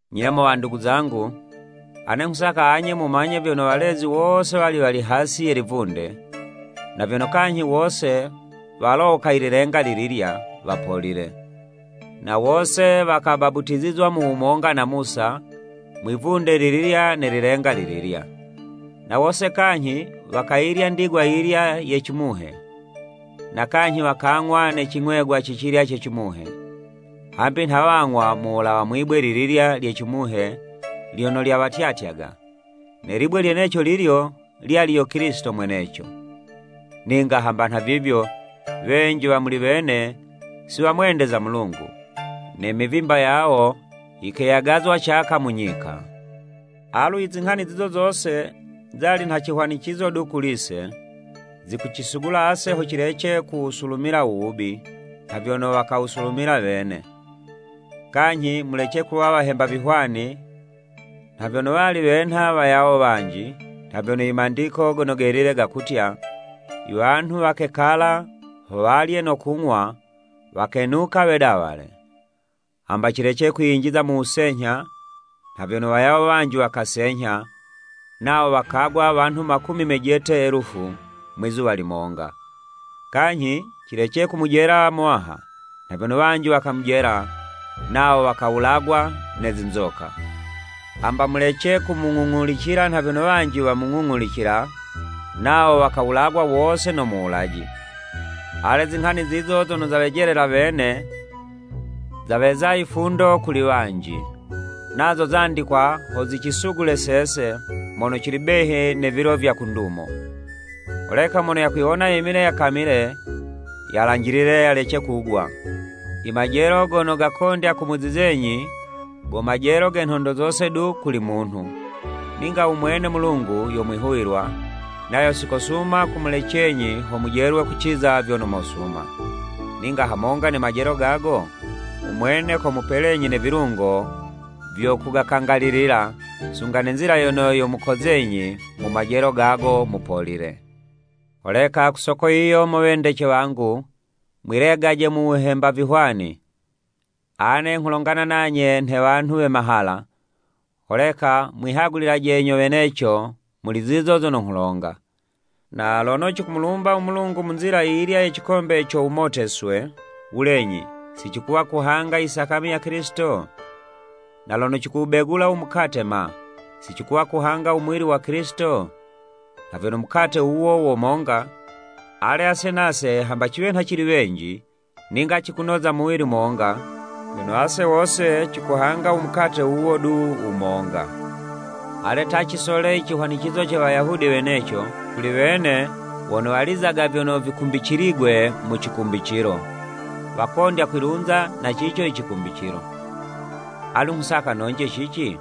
Nye mo wandugu zangu, ane nghusaka anye mumanye vyono walezi wose wali wali hasi ye livunde, na vyono kanyhi wose walowoka i lilenga lililya, wapolile. Na wose wakabaputizizwa mu wumonga na Musa, mwi'vunde lililya ne lilenga lililya. Na wose kanyhi, wakayilya ndigwa yiyilya ye cimuhe. Na kanyhi wakang'wa ne cing'wegwa cicilya ce cimuhe, hambi nha wang'wa mu wulawa mwi'bwe lililya lye cimuhe lyono lyawatyatyaga, ne libwe lyeneco lilyo, lyali yo Kilisito mweneco. Ninga hamba nhavivyo, wenji wa muli wene si wamwendeza u Mulungu, ne mivimba yawo yikeyagazwa caka mu nyika. Alu i zinghani zizo zose, zali nha cihwanicizo du kuli'se, zikucisugula ase ho cilece kuwusulumila u wubi, nha vyono wakawusulumila wene. Kanyhi mulece kuwa wahemba vihwani, nha vyono wali wenha wayawo wanji, nha vyono i Mandiko Gono Gelile gakutya, “I wanhu wakekala ho walye no kung'wa, wakenuka wedawale.” Hamba cilece kwiyinjiza mu wusenyha, nha vyono wayawo wanji wakasenyha, nawo wakagwa wanhu makumi mejete elufu mwizuwa limonga. Kanyhi, cilece kumujela u Muwaha, nha vyono wanji wakamujela, nawo wakawulagwa ne zinzoka. Hamba mulece kumung'ung'ulicila nha vyono wanji wamung'ung'ulicila, nawo wakawulagwa wose no Muwulaji! Ale, zinghani zizo zono zawejelela wene, zaweza yifundo kuli wanji, nazo zandikwa ho zicisugule sese, mono cili behi ne vilo vya ku ndumo. Holeka mono yakwiwona yemile yakamile, yalanjilile yalece kugwa. I majelo gono gakondya kumuzizenyi, go majelo ge nhondo zose du kuli munhu. Ninga umwene Mulungu, yo mwihuwilwa, nayo si kosuma kumulecenyi ho mujelwe kuciza vyono mosuma, ninga hamonga ne majelo gago, u mwene komupelenyi ne vilungo vyo kugakangalilila, sunga ne nzila yono yomukozenyi mu majelo gago mupolile. Holeka ku soko yiyo mo wendece wangu, mwilegaje mu wuhemba vihwani. Ane nghulongana nanye nhe wanhu we mahala, holeka mwihagulilaje nyo weneco muli zizo zono nghulonga. Na lono cikumulumba u Mulungu mu nzila yiyilya ye cikombe co wumoteswe, wulenyi si cikuwa kuhanga i sakami ya Kilisito? Na lono cikuwubegula u mukate ma, si cikuwa kuhanga u muwili wa Kilisito? Nha vyono mukate wuwo wo monga, ale, ase nase hamba ciwe nha cili wenji, ninga cikunoza muwili monga, vyono ase wose cikuhanga u mukate wuwo du wumonga. Ale, ta, cisole i cihwanicizo ce Wayahudi weneco, kuli wene, wono walizaga vyono vikumbiciligwe mu cikumbicilo, wakondya kwilunza na cico icikumbicilo. Alu nghusaka nonje cici?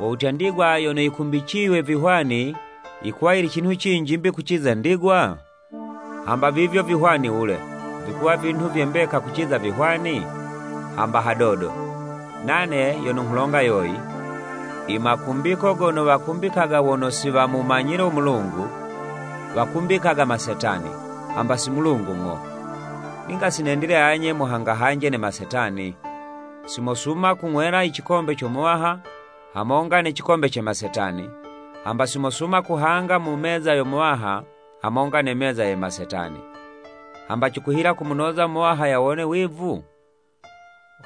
Wo wutya ndigwa yono yikumbiciywe vihwani yikuwa yili cinhu cinji 'mbi, kuciza ndigwa? Hamba vivyo vihwani wule, vikuwa vinhu vye mbeka kuciza vihwani? Hamba hadodo! Nane yono nghulonga yoyi, i makumbiko gono wakumbikaga wono si wamumanyile u Mulungu, wakumbikaga masetani, hamba si Mulungu ng'o. Ninga si nendile anye muhangahanje ne masetani. Si mosuma kung'wela i cikombe co Muwaha, hamonga ne cikombe ce masetani, hamba si mosuma kuhanga mu meza yo Muwaha hamonga ne meza ye masetani. Hamba cikuhila kumunoza u Muwaha yawone wivu?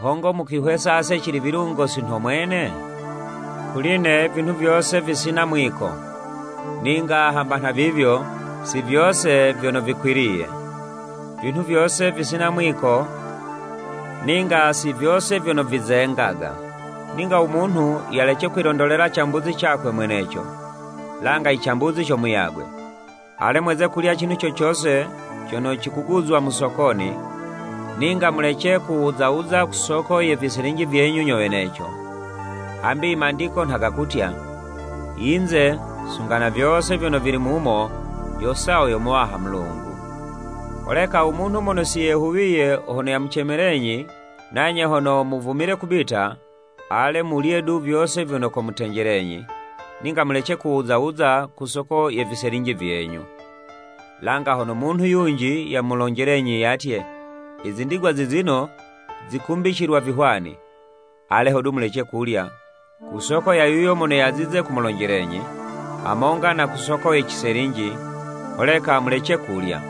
Hongo mukwihwesa ase cili vilungo si nho mwene? Kuli'ne ivinhu vyose visina mwiko, ninga hamba nhavivyo, si vyose vyono vikwiliye. Vinhu vyose visina mwiko ninga si vyose vyono vizengaga. Ninga u munhu yalece kwilondolela cambuzi cakwe mweneco, langa i cambuzi co muyagwe. Ale, mweze kulya cinhu co cose cono cikuguzwa mu sokoni, ninga mulece kuwuza wuza ku soko ye viselinji vyenyu nyo weneco, hambi i Mandiko nha gakutya, “Yinze sunga na vyose vyono vili mumo, yo sawo yo Muwaha Mulungu.” Holeka umunhu mono si yehuwiye, hono yamucemelenyi, nanye hono muvumile kubita, ale, mulye du vyose vyono komutenjelenyi, ninga mulece kuwuza wuza ku soko ye viselinji vyenyu. Langa hono munhu yunji yamulonjelenyi yatye, “I zindigwa zizino zikumbicilwa vihwani.” Ale hodu mulece kulya ku soko ya yuyo mono yazize kumulonjelenyi, hamonga na ku soko ye ciselinji, holeka mulece kulya.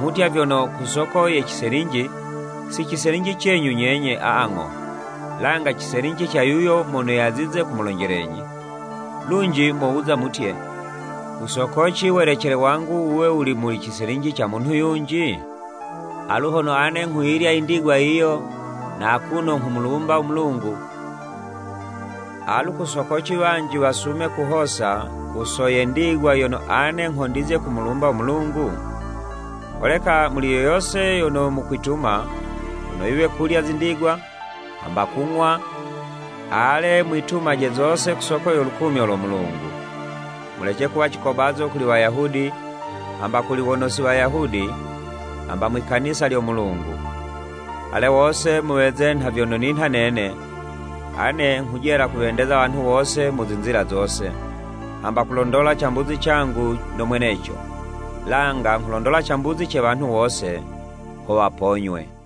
Nghutya vyono “Kusoko ye ciselinji, si ciselinji cenyu nyenye, aa ng'o, langa ciselinji ca yuyo mono yazize kumulonjelenyi.” Lunji mowuza mutye, “Kusoko ci welecele wangu wuwe wuli muli ciselinji ca munhu yunji? Alu hono ane nghuyilya i ndigwa yiyo na akuno nghumulumba u Mulungu, alu ku soko ci wanji wasume kuhosa ku soko ye ndigwa yono ane nghondizye kumulumbila u Mulungu?” Holeka muli yo yose yono mukwituma, hono yiwe kulya zindigwa, hamba kung'wa, ale mwitumaje zose ku soko yo lukumyo lo Mulungu. Mulece kuwa cikobazo kuli Wayahudi, hamba kuli wono si Wayahudi, hamba mwi'kanisa lyo Mulungu. Ale, wose muweze nha vyono ninha nene, ane nghujela kuwendeza wanhu wose mu zinzila zose, hamba kulondola cambuzi cangu no mweneco, langa nghulondola cambuzi ce wanhu wose, ho waponywe.